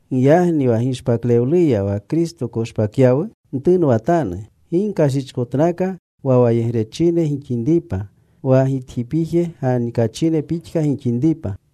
Giyagni wa gishpaklewluya wa Kristo koshpakyawu, ntunwatanu. Gi gkashichkotnaka wa wayegrechine gixinripa, wa gitjipije ganikachine pixka gixinripa.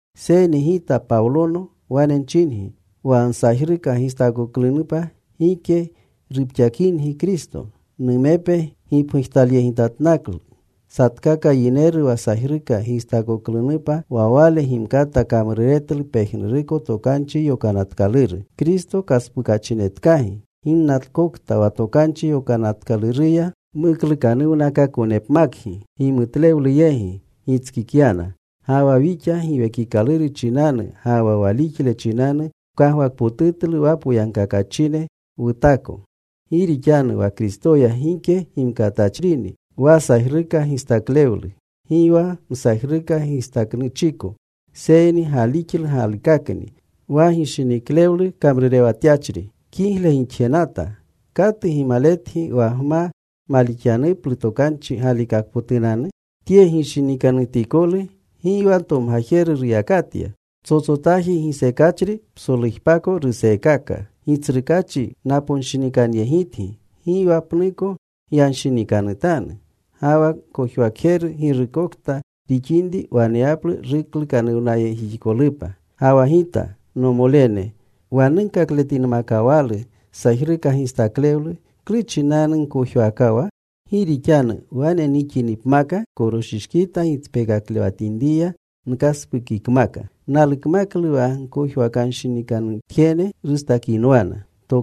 Seyni gita Pawlono wane nchingi, wa nsajruka gistaakoklunupa gike rupxakingi Kristo. Numepe gipgujtalyegitatnaklu satkaka yineru wa sajruka gistaakoklunupa, wa wale gimkata kamruretlu pejnuruko Tokanchi Yokanatkaluru. Kristo kaspukachinetkagi ginnakokta wa Tokanchi Yokanatkaluruya muklukanuwnakaakonepmakgi. Gimutlewlu yegi gitskikyana. Ga wa wixa Giwekikaluru chinanu ga wa walixle chinanu wkagwakpotutlu wa poyagkakachine wutaako. Gi rixanu wa Kristoya gike gimkatachrini wa sajruka gistaklewlu, gi wa msajruka gistaaknuchiko, seyni galixlu galikakni wa gishiniklewlu kamrurewatyachri. Kigle gixjenata. ¿Katu gimaletgi wa gma malixyanuplu tokanchi galikakpotunanu? Tye gishinikanutikolu gi wa ntomgajeru ruyakatya. Ptsotsotaji gisekachri psolujpako ruseekaka. Gitsrukaachi naponshinikanyegitgi, gi wa pnuko gyanshinikanutanu. Ga wa gkojwakjeru girukokta rixinri waneyaplu ruklukanuwnayegjixikolupa. Ga wa gita, nomolene, wa nunkakletinmakawalu sajruka gistaklewlu, ¿klu chinanu nkojwaakawa? Gi rixanu wane nixinipmaka koroshishkita gitspekaklewatinriya nkaspukikmaka. Nalukmaklu wa gkojwakanshinikanutjene rustakinwana.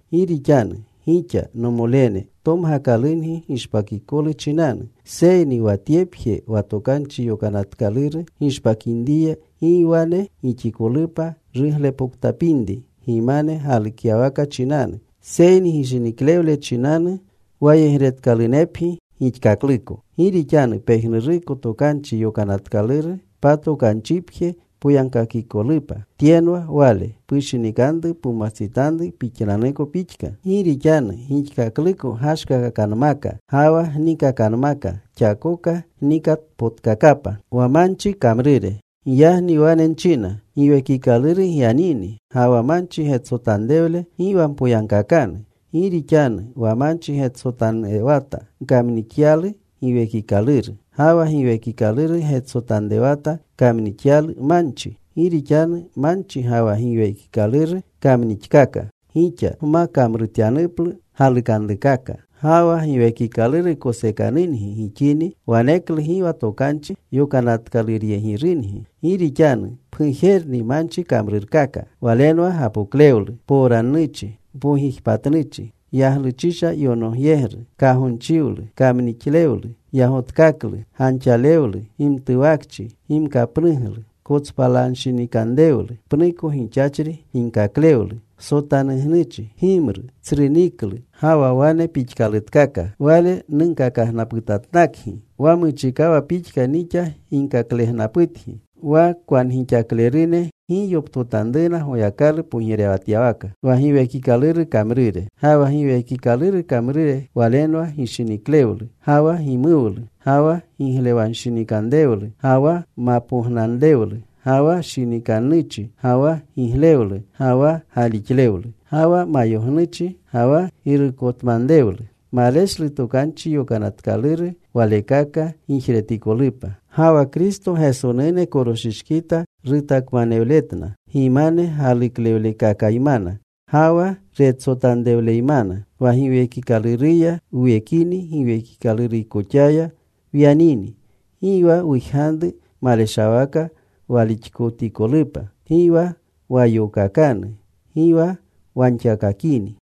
Gi rixanu gixa, nomolene, tomgakalungi gishpakikolu chinanu. Seyni wa tyepje, wa Tokanchi Yokanatkaluru gishpakinriya gi wane gixikolupa ruglepoktapinri gimane galukyawaka chinanu. Seyni gishiniklewle chinanu wayegretkaakalunepgi gixkakluko. Gi rixanu pejnuruko Tokanchi Yokanatkaluru patokanchipje poyagkakikolupa. Tyenwa wale: Pushinikanru pumwastsitanru pixnanuko pixka. Gi rixanu gixkakluko gashkakakanmaka ga wa gniikakanmaka, xakoka gnikatpotkakapa. Giyagni wane nchina, Giwekikaluru gyanini, ga wa manchi getsotanrewle gi wa mpoyagkakanu. Gi rixanu wa manchi getsotanrewata, kamnixyalu Giwekikaluru. Ga wa Giwekikaluru getsotanrewata, kamnixyalu manchi. Gi rixanu manchi ga wa Giwekikaluru kamnixkaka, gixa gma kamrutyanuplu galukanrukaka. Ga wa Giwekikaluru kosekanungi gixini, waneklu gi wa Tokanchi Yokanatkaluryegirungi. Gi rixanu pgujerni manchi kamrurkaka. Walenwa gapoklewlu, mpowrannuchi, mpogijpatnuchi, yagluchisha yonogyegru, kagonchiwlu, kamnixlewlu, yagotkaklu, ganxalewlu, gimtuwakchi, gimkapnuglu, kotspalanshinikanrewlu, pnuko gixachri ginkaklewlu, sotanugnuchi, gimru, tsru niklu, ga wa wane pixkalutkaka. Wale nunkakagnaputatnakgi, wa muchikawa pixka nixa ginkaklegnaputgi, wa kwangixaklerune gi yoptotanruna Goyakalu pogirewatyawaka. Ga wa Giwekikaluru kamrure walenwa gishiniklewlu, ga wa gimuwlu, ga wa giglewanshinikanrewlu, ga wa ma pognanrewlu, ga wa shinikannuchi, ga wa giglewlu, ga wa galixlewlu. Ga wa mayognuchi, ga wa girukotmanrewlu. Maleshlu tokanchi yokanatkaluru walekaka gijretikolupa. Ga wa Kristo Gesonune koroshishkita rutakmanewletna gimane galuklewlekakaymana ga wa retsotanrewleymana. Wa Giwekikaluruya wuwekini, Giwekikalurkoxaya wyanini. Gi wa wujganru maleshawaka walixkotikolupa. Gi wa wayookakanu. Gi wa wanxakakini.